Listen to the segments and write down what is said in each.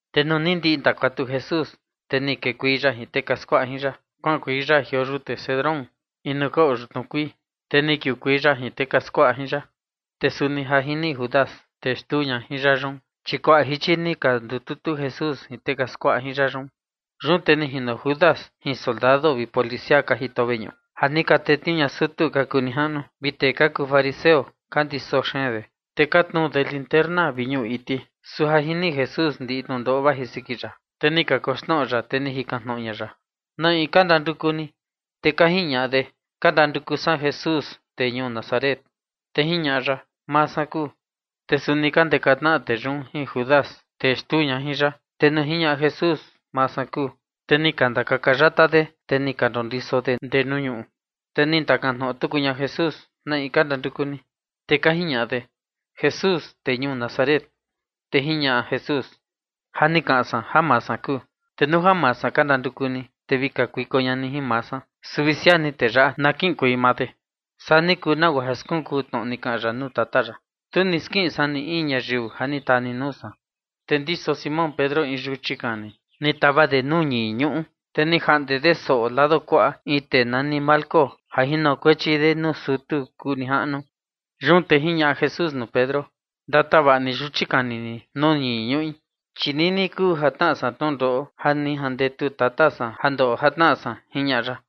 Te nuu ni ndiꞌi ni ndakuatu Jesús, te ni kekuei ya jin tee ka skuaꞌa jin ya kuaꞌankuei ya jioo yute Cedrón, in nuu ka oo yutnu kuii, te ni kiukuei ya jin tee ka skuaꞌa jin ya. Te suni ja jini Judas, tee xtuu ña jin ya yun, chi kuaꞌa jichi ni ka ndututu Jesús jin tee ka skuaꞌa jin ya yun. Yun te ni jino Judas jin soldado vi policia ka jito veñuꞌu, ja ni ka tetniuu ña sutu ka kuu nijaꞌnu vi tee ka kuu fariseo, ka ndiso xeen de, te ka tnuu de linterna vi ñuꞌu iti. Su ja jini Jesús ndiꞌi tnundoo vaji siki ya, te ni kakoxnoꞌo ya, te ni jikan tnoꞌo ña ya: ―¿Na in ka ndanduku ni? Te ka jiñaꞌa de: ―Ka ndanduku san Jesús, tee ñuu Nazaret. Te jiñaꞌa ya: ―Maa san kuu. Te suni ka ndeka tnaꞌa tee yun jin Judas, tee xtuu ña jin ya. Te nuu jiñaꞌa Jesús: “Maa san kuu”, te ni ka ndakaka yata de, te ni ka ndondiso de ndee nuu ñuꞌu. Te ni ndakan tnoꞌo tuku ña Jesús: ―¿Na in ka ndanduku ni? Te ka jiñaꞌa de: ―Jesús, tee ñuu Nazaret. Te jiñaꞌa Jesús: ―Ja ni kaꞌan san ja maa san kuu. Te nuu ja maa san ka ndanduku ni, te vi kakuiko ña ni jin maa san, su vi siaa ni tee yaꞌa na kiꞌinkuei maa de. Saa ni kuu nagua ja skunkuu tnoꞌo ni kaꞌan ya nuu Tata ya: “Tu ni skiꞌin san ni in ñayiu ja ni taa ni nuu san”. Te ndiso Simón Pedro in yuchi kani, ni tava de nuu ñii ñuꞌu, te ni jaꞌnde de soꞌo lado kuaꞌa in tee nani Malco ja jinokuechi de nuu sutu kuu nijaꞌnu. Yun te jiñaꞌa Jesús nuu Pedro: ―Ndatavaꞌa ni yuchi kani ni nuu ñii ñuꞌi, chi nini kuu ja tnaꞌa san tnundoꞌo ja ni jandetu Tata san ja ndoꞌo ja tnaꞌa san ―jiñaꞌa ya.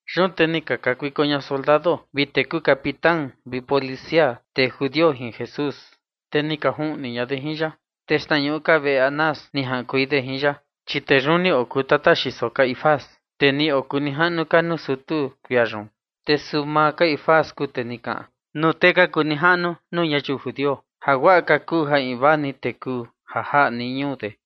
Yun te ni ka kakuiko ña soldado vi tee kuu capitán vi policia tee judio jin Jesús, te ni ka juꞌni ña de jin ya. Te xtnañuꞌu ka veꞌe Anás ni jaꞌankuei de jin ya, chi tee yun ni okuu tata xiso Caifás, tee ni okuu nijaꞌnu ka nuu sutu kuia yun. Te suu maa Caifás kuu tee ni kaꞌan nuu tee ka kuu nijaꞌnu nuu ñayiu judio ja guaꞌa ka kuu ja invaa ni tee kuu ja jaꞌa nii ñuu de.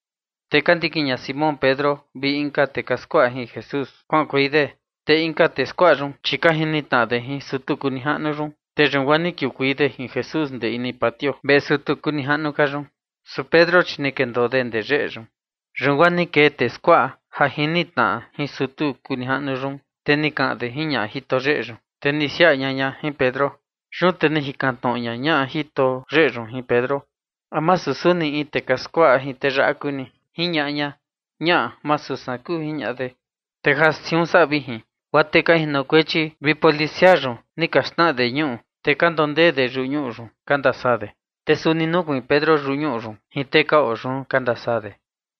Te ka ndikin ña Simón Pedro vi inka tee ka skuaꞌa jin Jesús kuaꞌankuei de. Te inka tee skuaꞌa yun, chi ka jini tnaꞌa de jin sutu kuu nijaꞌnu yun, te yun guaa ni kiukuei de jin Jesús ndee ini patio veꞌe sutu kuu nijaꞌnu ka yun. Su Pedro, chi ni kendoo de ndee yeꞌe yun. Yun guaa ni kee tee skuaꞌa ja jini tnaꞌa jin sutu kuu nijaꞌnu yun, te ni kaꞌan de jin ñaꞌa jito yeꞌe yun, te ni siaꞌa ña ña jin Pedro. Yun te ni jikan tnoꞌo ñaꞌa jito yeꞌe yun jin Pedro: ―¿A masu suni in tee ka skuaꞌa jin tee yaꞌa kuu ni? ―jiñaꞌa ña. ―Ñaꞌa, ma suu san kuu ―jiñaꞌa de. Te ja siun saꞌa vijin, guaa tee ka jinokuechi vi policia yun ni ka xnaꞌa de ñuꞌu, te ka ndondee de yuꞌu ñuꞌu yun ka ndasaa de. Te suni nukuiin Pedro yuꞌu ñuꞌu yun jin tee ka oo yun ka ndasaa de.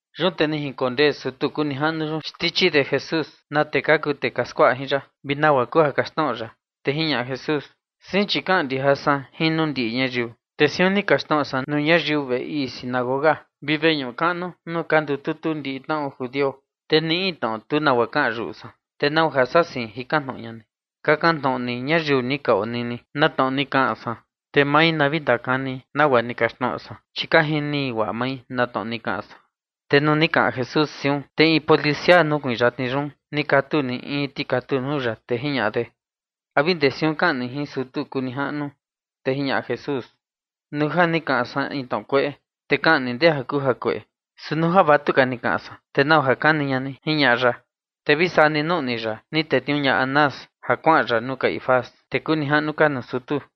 Yun te ni jinkondee sutu kuu nijaꞌnu yun xtichi de Jesús na tee ka kuu tee ka skuaꞌa jin ya, vi nagua kuu ja kaxtnoꞌo ya. Te jiñaꞌa Jesús: ―Sein chi kaꞌan ndijin san jin nuu ndiꞌi ñayiu, te siun ni kaxtnoꞌo san nuu ñayiu veꞌe ii sinagoga vi veñuꞌu kaꞌnu nuu ka ndututu ndiꞌi tnaꞌo judio, te ni in tnoꞌo tu nagua kaꞌan yuꞌu san. ¿Te nau ja saa sein jikan tnoꞌo ña ni? Kakan tnoꞌo ni ñayiu ni ka onini na tnoꞌo ni kaꞌan san, te mai na vi ndakani nagua ni kaxtnoꞌo san, chi ka jini guaꞌa mai na tnoꞌo ni kaꞌan san. Te nuu ni kaꞌan Jesús siun, te in policia nukuiin yatni yun, ni katu ni in tikatu nuu ya, te jiñaꞌa de: ―¿A vi ndee siun kaꞌan ni jin sutu kuu nijaꞌnu? Te jiñaꞌa Jesús: ―Nuu ja ni kaꞌan san in tnoꞌo kueꞌe, te kaꞌan ni ndee ja kuu jakueꞌe, su nuu ja vatuka ni kaꞌan san, ¿te nau ja kani ña ni? ―jiñaꞌa ya. Te vi saa ni nuꞌni ya, ni tetniuu ña Anás ja kuaꞌan ya nuu Caifás, tee kuu nijaꞌnu ka nuu sutu.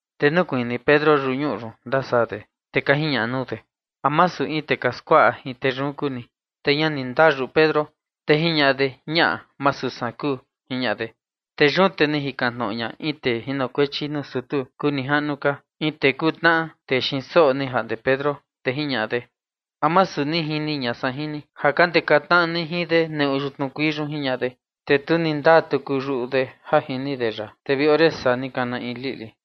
Te nukuiin ni Pedro yuꞌu ñuꞌu yun ndasaa de. Te ka jiñaꞌa nuu de: ―¿A masu in tee ka skuaꞌa jin tee yun kuu ni? Te ña ni ndaa yuꞌu Pedro, te jiñaꞌa de: ―Ñaꞌa, ma suu san kuu ―jiñaꞌa de. Yun te ni jikan tnoꞌo ña in tee jinokuechi nuu sutu kuu nijaꞌnu ka, in tee kuu tnaꞌa tee xiin soꞌo ni jaꞌnde Pedro, te jiñaꞌa de: ―¿A masu ni jini ña san jin ni ja ka ndeka tnaꞌa ni jin de neꞌu xtnuu kuii yun? ―jiñaꞌa de. Te tu ni ndaa tuku yuꞌu de ja jini de ya, te vi ore saa ni kana in liꞌli.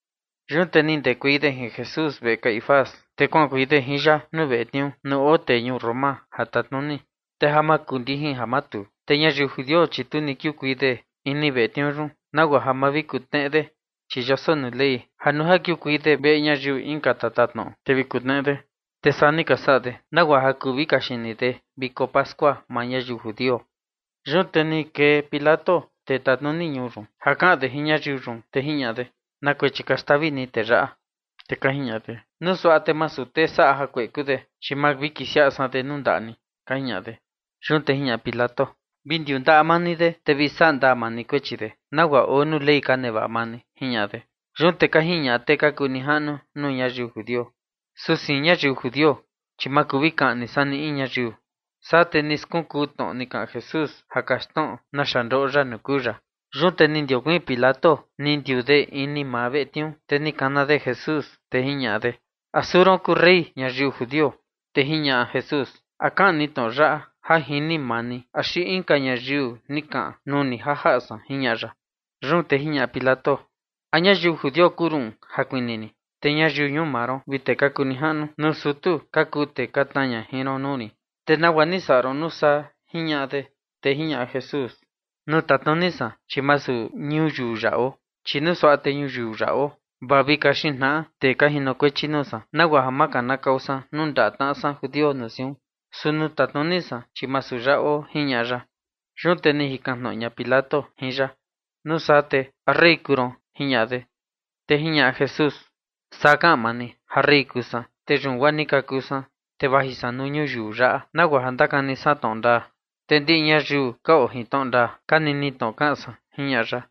Yun te ni ndekuei de jin Jesús veꞌe Caifás, te kuaꞌankuei de jin ya nuu veꞌe tniuu nuu oo tee ñuu Roma ja tatnuni. Te ja makundijin ja matuu, te ñayiu judio, chi tu ni kiukuei de ini veꞌe tniuu yun, nagua ja ma vi kutneꞌe de, chi yoso nuu Ley ja nuu ja kiukuei de veꞌe ñayiu inka tatatnoꞌo, te vi kutneꞌe de. Te saa ni ka saꞌa de, nagua ja kuu vi kaxini de viko pascua maa ñayiu judio. Yun te ni kee Pilato, tee tatnuni ñuu yun, ja kaꞌan de jin ñayiu yun, te jiñaꞌa de: ―¿Na kuechi ka xtavi ni tee yaꞌa? Te ka jiñaꞌa de: ―Nuu suaꞌa te masu tee saꞌa jakueꞌe kuu de, chi ma vi kisiaꞌa san de nuu ndaꞌa ni ―ka jiñaꞌa de. Yun te jiñaꞌa Pilato: ―Vi ndakuaka maa ni de, te vi saꞌa ndaa maa ni kuechi de nagua oo nuu Ley ka nevaꞌa maa ni ―jiñaꞌa de. Yun te ka jiñaꞌa tee ka kuu nijaꞌnu nuu ñayiu judio: ―Su sein ñayiu judio, chi ma kuu vi kaꞌni san ni in ñayiu. Saa te ni skunkuu tnoꞌo ni kaꞌan Jesús ja kaxtnoꞌo naxa ndoꞌo ya nuu kuu ya. Yun te ni ndiokuiin Pilato, ni ndiuu de ini maa veꞌe tniuu, te ni kana de Jesús, te jiñaꞌa de: ―¿A suu ron kuu rey ñayiu judio? Te jiñaꞌa Jesús: ―¿A kaꞌan ni tnoꞌo yaꞌa ja jini maa ni axi inka ñayiu ni kaꞌan nuu ni ja jaꞌa san? ―jiñaꞌa ya. Yun te jiñaꞌa Pilato: ―¿A ñayiu judio kuu ruꞌun ja kuni rin? Te ñayiu ñuu maa ron vi tee ka kuu nijaꞌnu nuu sutu ka kuu tee ka tnaa ña jin ron nuu rin. ¿Te nagua ni saꞌa ron nuu saa? ―jiñaꞌa de. Te jiñaꞌa Jesús: ―Nuu tatnuni san, chi masu ñuyiu yaꞌa oo, chi nuu suaꞌa te ñuyiu yaꞌa oo, vaa vi kaxin tnaꞌa tee ka jinokuechi nuu san, nagua ja ma kanakau san nuu ndaꞌa tnaꞌa san judio nuu siun. Su nuu tatnuni san, chi masu yaꞌa oo ―jiñaꞌa ya. Yun te ni jikan tnoꞌo ña Pilato jin ya: ―Nuu saa te ¿a rey kuu ron? ―jiñaꞌa de. Te jiñaꞌa Jesús: ―Saa kaꞌan maa ni ja rey kuu san. Te yun guaa ni kaku san, te vaji san nuu ñuyiu yaꞌa nagua ja ndakani san tnoꞌo ndaa. Te ndiꞌi ñayiu ka oo jin tnoꞌo ndaa ka nini tnoꞌo kaꞌan san ―jiñaꞌa ya.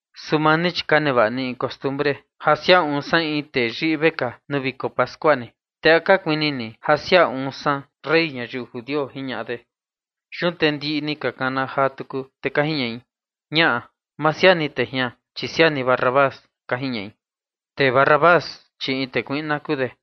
Su maa ni, chi ka nevaꞌa ni in costumbre ja siaa uun san in tee yiꞌi vekaa nuu viko pascua ni, ¿te a ka kuini ni ja siaa uun san rey ñayiu judio? ―jiñaꞌa de. Yun te ndiꞌi ni ka kana jaa tuku, te ka jiñaꞌi: ―Ñaꞌa, ma siaa ni tee jian, chi siaa ni Barrabás ―ka jiñaꞌi. Te Barrabás, chi in tee kuiꞌna kuu de.